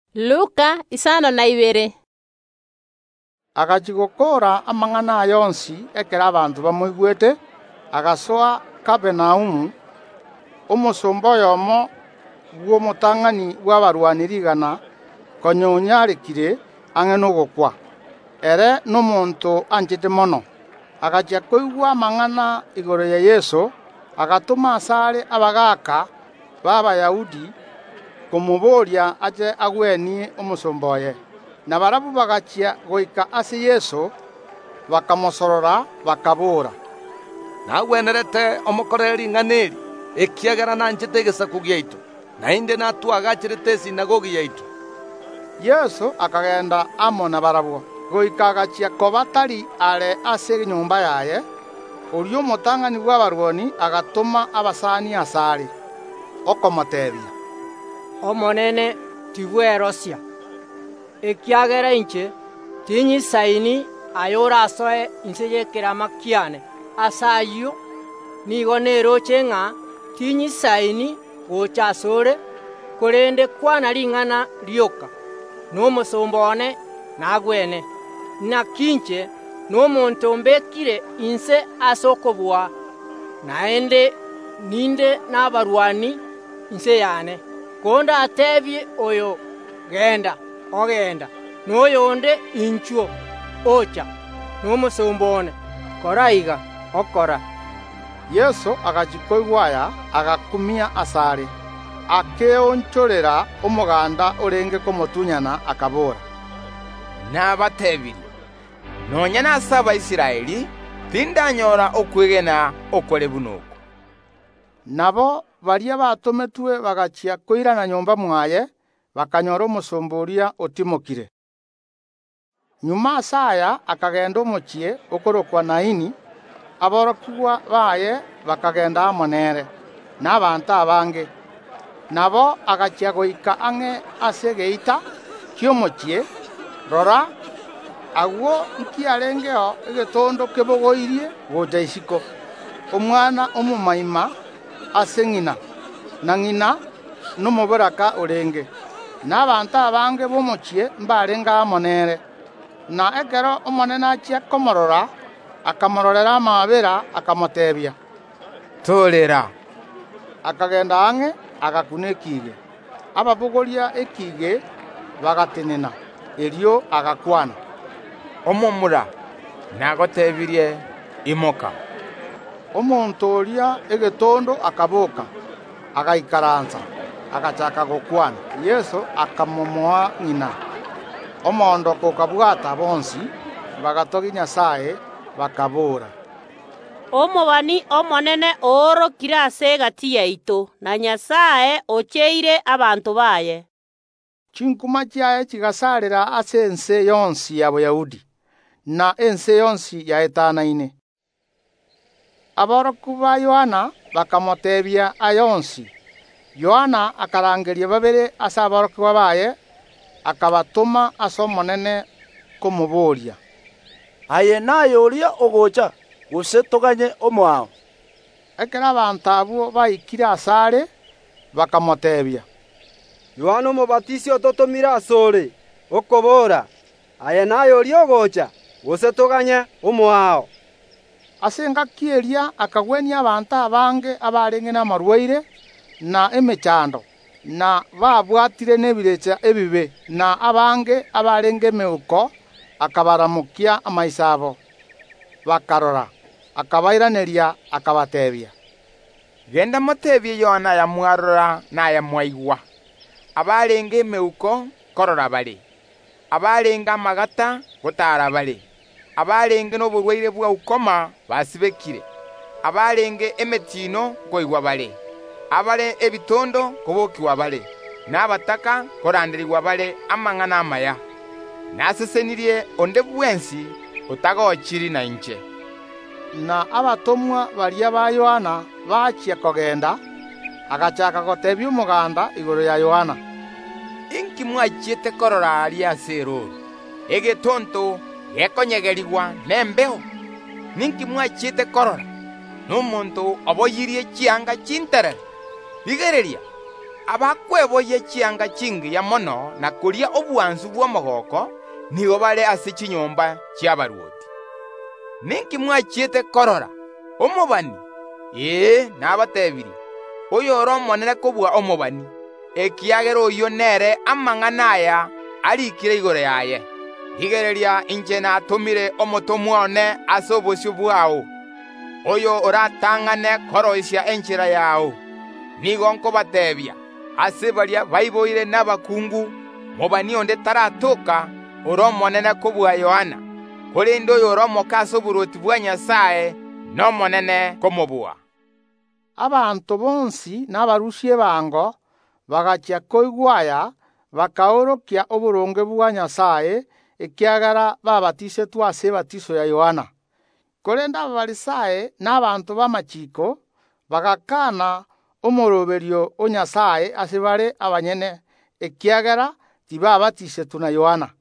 Magega Yeso gakorire gokwana amang’ana onsi aria arigetie abanto baigwe, agasoa Kapernaumu. Omosomba oyomo bw’omotang’ani bw’abarwani rigana konya onyarekire nigo arenge ang’e nogokwa; ere nomonto anchete mono. Agachia koigwa amang’ana igoro ya Yeso, agatoma asare abagaaka b’Abayahudi komoboria ache agwenie omosomba oye. Na barabwo bagachia goika ase Yeso, bakamosorora, bakaboora, “Nagwenerete omokorere ring’ana eri, ekiagera nanchete abanto baito, naende natoagacherete esinagogi yaito.” Yeso akagenda amo nabarabwo. Goika agachia koba tari are ase enyomba yaye, oria omotang’ani bw’abarwani agatoma abasani asare, okomoteebia, “Omonene, tibwerosia, ekiagera inche ting’isaini aye orasoe inse y’ekerama kiane. Ase ayio nigo neroche ng’a ting’isaini gocha ase ore; korende kwana ring’ana rioka, na omosomba one nagwene. Naki inche nomonto mbekire inse ase okobua, naende ninde nabasikari inse yane. Kondateebie oyo: Genda, ogenda, na oyonde: Inchuo, ocha; na omosomba one: Kora iga, okora.” Yeso agachia koigwa aya, agakumia asare, akeonchorera omoganda orenge komotunyana, akabora, “Nabatebirie: Nonya nase Abaisraeli tindanyora okwegena okore buna oko.” Nabo baria batometwe bagachia koirana nyomba mwaye, bakanyora omosomba oria otimokire. Magega ase aya akagenda omochie okorokwa Naini; aborokigwa baye bakagenda amo nere, na abanto abange. Nabo, agachia goika ang’e ase egeita ki’omochie, rora, agwo nkiarengeo egetondo kebogoirie gocha isiko, omwana omomoima ase ng’ina, na ng’ina nomoboraka orenge, na abanto abange b’omochie mbarenge amo nere. Na ekero Omonene achia komoorora akamororera amaabera, akamoteebia, “Torera!” Akagenda ang’e, agakuna esanduki; baria babogoretie esanduki bagatenena. Erio agakwana, “Omomura, nagotebirie, imoka!” Omonto oria egetondo akaboka, agaikaransa, agachaaka gokwana. Yeso akamomoa ng’ina. Omoondoko okabwata bonsi, bagatogia, Nyasae, bakaboora, “Omobani omonene oorokire ase egati yaito!” Na “Nyasae ocheire abanto baye!” Chinkuma chiaye chigasarera ase ense yonsi ya Boyahudi, na ense yonsi yaetanaine. Aborokigwa ba Yohana bakamoteebia aya onsi, erio Yohana akarangeria babere ase aborokigwa baye, akabatoma ase Omonene komoboria, “Aye naye oria ogocha, gose toganye omoao?” Ekero abanto abwo baikire asare, bakamoteebia, “Yohana Omobatisi ototomire ase ore, okobora: Aye naye oria ogocha, gose toganye omoao?” Ase engaki eria Yeso akagwenia abanto abange abarenge namarwaire, na emechando, na babwatire n’Omoika omobe; na abange abarenge emeuko akabaramokia amaiso abo, bakarora. Akabairaneria, akabateebia, “Genda moteebie Yohana ayamwarora na aya mwaigwa: Abarenge emeuko nkorora bare, abarenge amagata ngotaara bare, abarenge noborwaire bwa ukoma basibekire, abarenge emetino nkoigwa bare, abare ebitondo nkobokigwa bare, na abataka nkoranderigwa bare amang’ana amaya. Nasesenirie onde bwensi otagochiri nainche.” Na abatomwa baria ba Yohana bachia kogenda, agachaaka goteebia omoganda igoro ya Yohana, “Inki mwachiete korora aria ase erooro? Egetonto gekonyegerigwa nembeo? Ninki mwachiete korora? Nomonto oboyirie chianga chinterere? Rigereria, abakweboyia chianga chingiya mono, na koria obwansu bw’omogooko, nigo bare ase chinyomba chi’abarwoti. Ninki mwachiete korora? Omobani? Ee, nabateebirie: Oyore omonene kobua omobani, ekiagera oyio nere amang’ana aya ariikire igoro yaye, “Rigereria, inche natomire omotomwa one ase obosio bwao, oyo oratang’ane koroisia enchera yao. Nigo nkobateebia: Ase baria baiboire nabakungu, mobani onde taratoka ore omonene kobua Yohana, korende oyore omoke ase oborwoti bwa Nyasae nomonene komobua.” (Abanto bonsi na abarusia ebango bagachia koigwa aya, bakaorokia oboronge bwa Nyasae, ekiagera baabatisetwe ase ebatiso ya Yohana; korende Abafarisai na abanto b’amachiiko bagakana omooroberio o Nyasae ase bare abanyene, ekiagera tibaabatisetwe na Yohana.)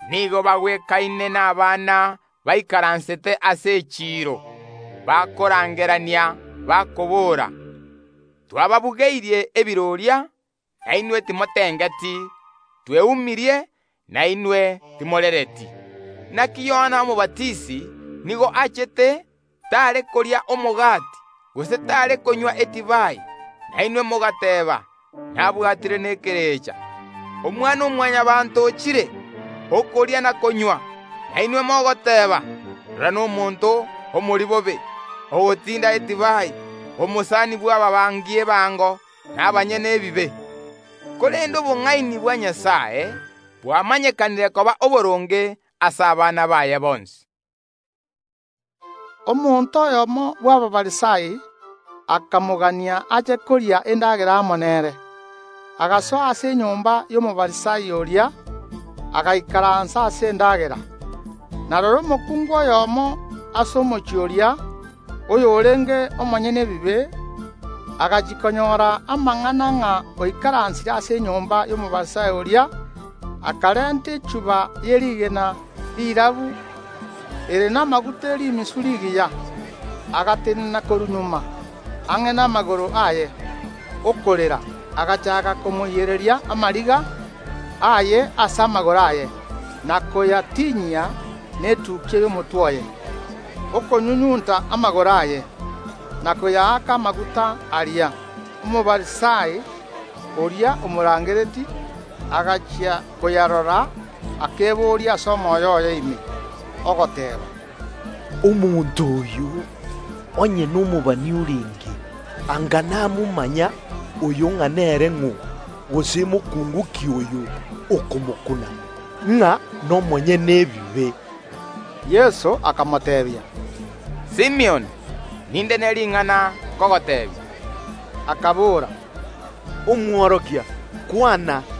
Nigo bagwekaine nabana baikaransete ase echiiro, bakorangerania, bakobora, “Twababugeirie ebiroria, na inwe timotengeti; tweumirie, na inwe timorereti. Naki Yohana Omobatisi nigo achete, tare koria omogati, gose tare konywa edivai; na inwe mogoteeba: Nabwatire nekerecha. Omwana‐o‐Mwanyabaanto ochire, okoria na konywa, na inwe mogoteeba: Rora, nomonto omoribobe, ogotinda edivai, omosani bw’ababarusia ebango na abanyene ebibe! Korende obong’aini bwa Nyasae bwamanyekanire koba oboronge ase abana baye bonsi.” Omonto oyomo bw’Abafarisai akamoarigania ache koria endagera amo nere. Agasoa ase enyomba y’Omofarisai oria, agaikaransa ase endagera. Na rora, omokungu oyomo ase omochie oria, oyorenge omonyene ebibe, agachia konyora amang’ana ng’a oikaransire ase enyomba y’Omofarisai oria, akarenta echuba ye rigena rirabu ere namaguta e rimisu rigiya, agatenena korwa magega, ang’e namagoro aye, okorera. Agachaaka komoiyereria amariga aye ase amagoro aye, na koyatinyia netukia y’omotwe oye, okonyunyunta amagoro aye, na koyaaka amaguta aria. Omofarisai, oria omoariganetie, agachia koyarora akeboria ase omoyo oye ime, ogoteeba, “Omonto oyo, onye nomobani orenge, anga namomanya oyo ng’a nere ng’o, gose mokuungu ki oyo okomokuna, ng’a nomonyene ebibe.” Yeso akamoteebia, “Simioni, ninde ne ring’ana nkogoteebia.” Akabora, “Omworokia, kwana.”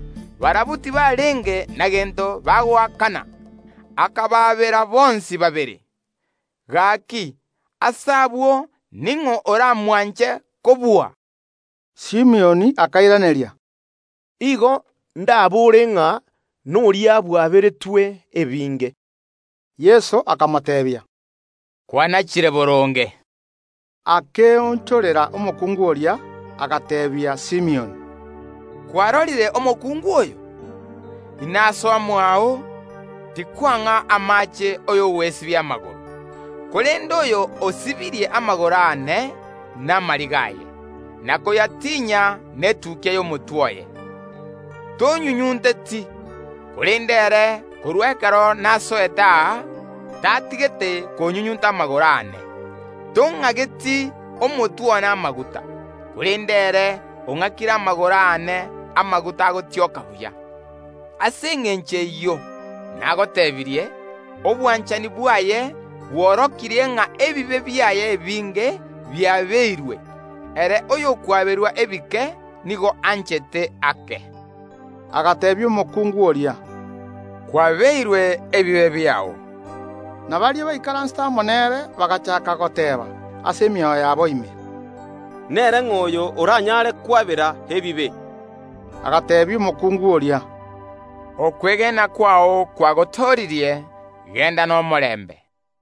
Barabwo tibarenge na gento bagoakana. Akabaabera bonsi babere. Gaki, ase abwo, ning’o oramwanche kobua?” Simioni akairaneria, “Igo ndabore ng’a, noria bwaberetwe ebinge.” Yeso akamoteebia, “Kwanachire boronge.” Akaonchoka gochia ase omokungu oria, agateebia Simioni, “Kwarorire omokungu oyo? Inasoa mwao, tikwang’a amaache ay’ogwesibia amagoro, korende oyo osibirie amagoro aane namariga aye, na koyatinyia netukia y’omotwe oye. Tonyunyunteti, korende ere korwa ekero nasoete aa tatigeti konyunyunta amagoro aane. Tong’ageti omotwe one amaguta, korende ere ong’akire amagoro aane amaguta agotioka buya. Ase engencho eyio nagotebirie, obwanchani bwaye bworokirie ng’a ebibe biaye ebinge biabeirwe; ere oyokwaberwa ebike nigo anchete ake.” Agateebia omokungu oria, “Kwabeirwe ebibe biao.” Na baria baikaransete amo nere bagachaaka goteeba ase emioyo yabo ime, “Nere ng’o oyo oranyare kwabera ebibe?” Agateebia omokungu oria, “Okwegena kwao kwagotooririe; genda nomorembe.”